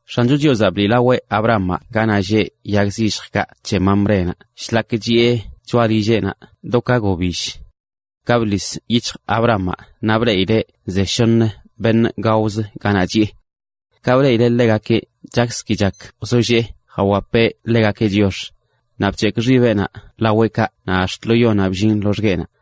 X̱ancho Chiozaꞌ bliꞌlaweꞌ Abrahamaꞌ ganaꞌ lleꞌ yag zilljkaꞌ c̱he Mamrénaꞌ shlak chiꞌe choꞌa lilleꞌnaꞌ do ka gobill. Ka bḻis yic̱hj Abrahamaꞌ naꞌ bleꞌileꞌ ze shoṉə beṉꞌ gaozə ganaꞌ chiꞌe. Ka bleꞌileꞌ ḻegakeꞌ chakz ki chak wzollee jawapeꞌ ḻegakeꞌ chiox, naꞌ bc̱hekꞌ xibeꞌnaꞌ laweꞌkaꞌ naꞌ ax̱t lo yonaꞌ bllin loxgueꞌnaꞌ,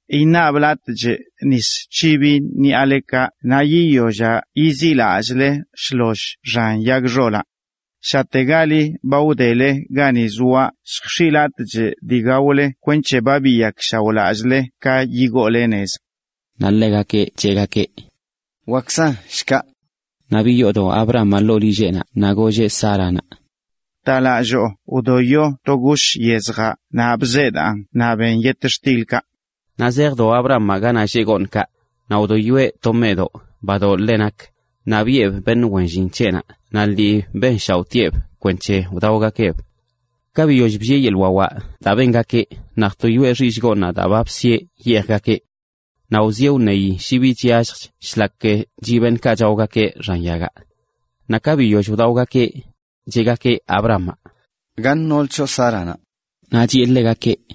Iṉablatchꞌ nis c̱hibi ṉiꞌalekaꞌ naꞌ yiyollaꞌ yiziꞌlallꞌle shloll xan yag xolaꞌ. Shategali ba wdele gani zoaꞌ lljx̱ichꞌ(iꞌ) latꞌ dii gaole kwenc̱he ba biyakshaoꞌlallꞌle ka yigoole nez. Naꞌ ḻegakeꞌ cheꞌgakeꞌ: ―Wakkzan shkaꞌ. Naꞌ biyoodo Abrahamaꞌ ḻoo lilleꞌnaꞌ naꞌ golleꞌ Sáranaꞌ: ―Bta lalloo wdoyo to gush yezjaꞌ naꞌ bzeedaan naꞌ ben yetxtilkaꞌ. Naꞌ zejdo Abrahamaꞌ ganaꞌ lleꞌ gooṉkaꞌ, naꞌ wdoyoeꞌ to meꞌdoꞌ badoꞌ ḻe nak, naꞌ biꞌeb beṉꞌ wen llin c̱heꞌnaꞌ naꞌ lii benshaoꞌtieꞌb kwenc̱he wdaogakeꞌb. Ka biyoll bllieꞌ yeḻꞌ wawaꞌ daa bengakeꞌ naꞌ jtoyoꞌe xillꞌ gooṉ daa ba bsiꞌe yeejgakeꞌ. Naꞌ wzieꞌ wṉeyi shi bi chyalljch shlak chiꞌ beṉꞌkaꞌ chaogakeꞌ xan yagaꞌ. Naꞌ ka biyoll wdaogakeꞌ, cheꞌgakeꞌ Abrahamaꞌ: ―¿Gaṉ nool choꞌ Sáranaꞌ? Naꞌ chiꞌe ḻegakeꞌ: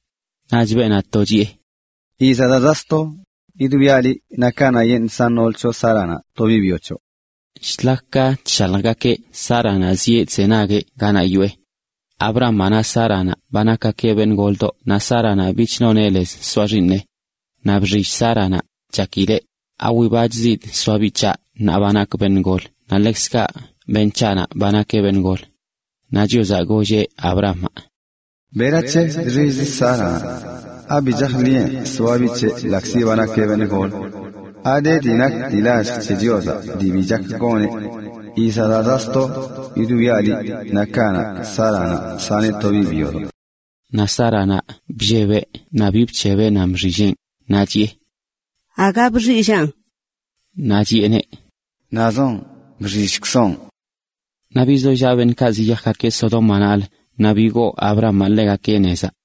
Naꞌch beenaꞌ to chiꞌe: ―Yizaꞌ daa zaꞌ sto yidwiaꞌ liꞌ naꞌ kanaꞌyeṉꞌ san nool c̱hoꞌ Sáranaꞌ to biꞌ byo c̱hoꞌ. Shlak ka chshaljgakeꞌ Sáranaꞌ zieꞌ chzenagueꞌ ganaꞌ yoꞌe. Abrahamaꞌ naꞌ Sáranaꞌ ba nakgakeꞌ beṉꞌ goldoꞌ naꞌ Sáranaꞌ bich noneꞌ lez soa xiiṉeꞌ. Naꞌ bxill Sáranaꞌ, chakileꞌ: “¿Awibachzidꞌ soa biꞌ c̱haꞌ ṉaa ba nakꞌ beṉꞌ gol naꞌ ḻekzkaꞌ beṉꞌ c̱haꞌnaꞌ ba nakeꞌ beṉꞌ gol?” Naꞌ Chiozaꞌ golleꞌ Abrahamaꞌ: ―¿Berac̱he chxillzə Sáranaꞌ? ¿Abi chajḻiꞌe soa biꞌ c̱heꞌ ḻaꞌkzi ba nakeꞌ beṉꞌ gol? ¿Ade dii nak dii lallj c̱he Chiozaꞌ dii bi gak goneꞌ? Yizaꞌ daa zaꞌ sto yidwiaꞌ liꞌ, naꞌ kanaꞌ Sáranaꞌ saneꞌ to biꞌ byodoꞌ. Naꞌ Sáranaꞌ bllebeꞌ naꞌ bi bc̱hebeꞌ nan bxilleꞌn, naꞌ chiꞌe: ―Aga bxillaꞌn. Naꞌ chiꞌeneꞌ: ―Nazoꞌn, bxillkzoꞌn. Naꞌ bizollaꞌ beṉꞌkaꞌ naꞌ zjayaakeꞌ Sodómanaꞌlə, naꞌ bigoo Abrahamaꞌ ḻegakeꞌ nezaꞌ.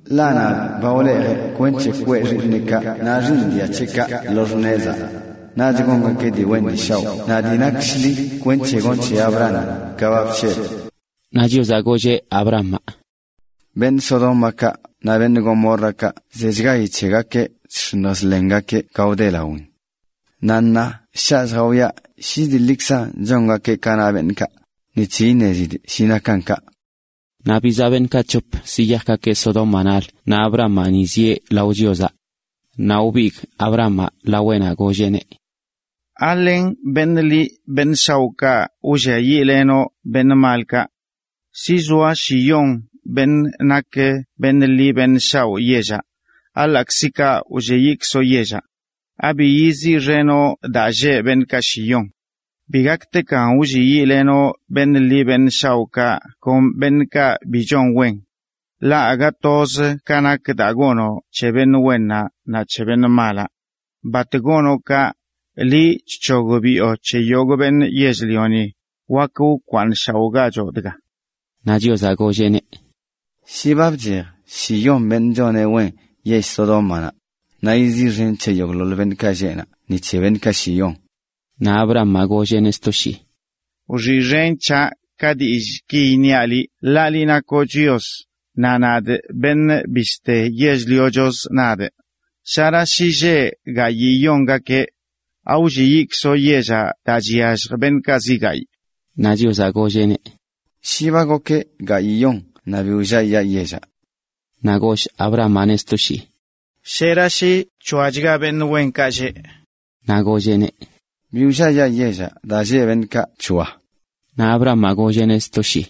Ḻaꞌ nadꞌ ba wlejee kwenc̱he kwee xiiṉeꞌkaꞌ naꞌ xiiṉ dia c̱heꞌkaꞌ lo x̱nezaa. Naꞌch gongakeꞌ dii wen dii shaoꞌ naꞌ dii nak shḻi kwenc̱he gonꞌ c̱he Abrahami ka ba bc̱hebꞌ.” Naꞌ Chiozaꞌ golleꞌ Abrahamaꞌ: ―Beṉꞌ Sodómakaꞌ naꞌ beṉꞌ Gomórrakaꞌ zechgayi c̱hegakeꞌ chx̱iṉj chḻengakeꞌ ga wde lawin. Naꞌ ṉaa shaꞌ lljawiaꞌ shi dii ḻikzan chongakeꞌ ka na beṉꞌkaꞌ, kwenc̱he iṉezidꞌ shi nakan kaꞌ. Naꞌ bizaꞌ beṉꞌkaꞌ c̱hop zejgakeꞌ Sodómanaꞌlə naꞌ Abrahamaꞌ ni zieꞌ lao Chiozaꞌ. Naꞌ wbigꞌ Abrahamaꞌ laweꞌnaꞌ golleꞌneꞌ: ―¿Alen beṉꞌ ḻi beṉꞌ shaoꞌkaꞌ wlliayiꞌlenoꞌ beṉꞌ malkaꞌ? Shi zoa shiyon beṉꞌ nak beṉꞌ ḻi beṉꞌ shaoꞌ yellaꞌ, ¿aḻaꞌkzi kaꞌ wlliayikzoꞌ yellaꞌ? ¿Abi yiziꞌxenoꞌ daa lleꞌ beṉꞌkaꞌ shiyon? Bi gaktekan wlliayiꞌlenoꞌ beṉꞌ ḻi beṉꞌ shaoꞌkaꞌ kon beṉꞌkaꞌ bi chon wen. Ḻaꞌ aga toz ka nak daa gonoꞌ c̱he beṉꞌ wennaꞌ naꞌ c̱he beṉꞌ malaꞌ. ¡Bat gonoꞌ kaꞌ! Liꞌ chc̱hogbiꞌo c̱he yogꞌ beṉꞌ yell-lioni, wak wkwaaṉshaoꞌgachoꞌ dga. Naꞌ Chiozaꞌ golleꞌneꞌ: ―Shi ba bchej shiyon beṉꞌ choneꞌ wen yell Sodómanaꞌ, naꞌ yiziꞌxen c̱he yogꞌḻoḻ beṉꞌkaꞌ lleꞌ naꞌ ni c̱he beṉꞌkaꞌ shiyon. Naꞌ Abrahamaꞌ golleꞌneꞌ sto shii: ―Wxiꞌxen c̱haꞌ ka dillꞌki iṉiaꞌ liꞌ, ḻaꞌ liꞌ nakoꞌ Chios, naꞌ nadꞌ nakꞌ beṉꞌ bishte yell-liochozə. Shera shi lleꞌ gayiyonga beṉꞌ wenkaꞌ, ¿awlliayiꞌkzoꞌ yellaꞌ daa chyallj beṉꞌkaꞌ zi gayꞌ? Naꞌ Chiozaꞌ golleꞌneꞌ: ―Shi ba gokeꞌ gayiꞌyon naꞌ bi wlliayaa yellaꞌ. Naꞌ goll Abrahamaꞌneꞌ sto shii: ―¿Shera shi c̱hoachga beṉꞌ wenkaꞌ lleꞌ? Naꞌ golleꞌneꞌ: ―Bi wlliayaa yellaꞌ daa lleꞌ beṉꞌkaꞌ c̱hoa. Naꞌ Abrahamaꞌ golleꞌneꞌ sto shii: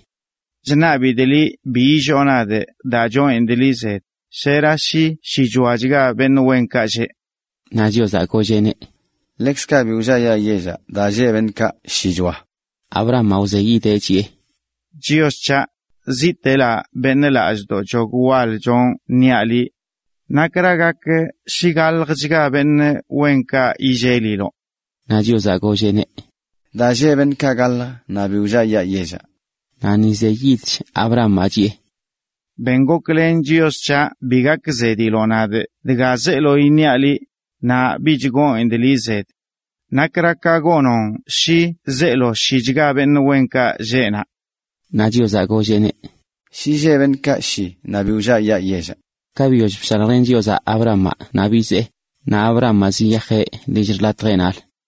―Chṉabidꞌ liꞌ bi illoo nadꞌ daa chonidꞌ liꞌ zed. ¿Shera shi shichoachga beṉꞌ wenkaꞌ lleꞌ? Naꞌ Chiozaꞌ golleꞌneꞌ: ―Ḻekzkaꞌ bi wlliayaa yellaꞌ daa lleꞌ beṉꞌkaꞌ shichoa. Abrahamaꞌ wzeyidcheꞌ chiꞌe: ―Chios c̱haꞌ, ziꞌtelə beṉꞌ lallꞌ chog wal chonꞌ niaꞌ liꞌ, ¿nakra gak shi galjchga beṉꞌ wenkaꞌ lleꞌ? Naꞌ Chiozaꞌ golleꞌneꞌ: ―Daa lleꞌ beṉꞌkaꞌ gaḻjə naꞌ bi wlliayaa yellaꞌ. Naꞌ ni zeyidch Abrahamaꞌ, chiꞌe: ―Ben goklen, Chios c̱haꞌ, bi gakzediloꞌ nadꞌ dga zeelo iṉiaꞌ liꞌ, naꞌ bich gonidꞌ liꞌ zed. ¿Nakra ka gonoꞌn shi zeelo shichga beṉꞌ wenkaꞌ lleꞌ naꞌ? Naꞌ Chiozaꞌ golleꞌneꞌ: ―Shi lleꞌ beṉꞌkaꞌ shi naꞌ bi wlliayaa yellaꞌ. Ka biyoll bshaljlen Chiozaꞌ Abrahamaꞌ naꞌ bizee, naꞌ Abrahamaꞌ ziyajeꞌ lill xḻatjeꞌnaꞌlə.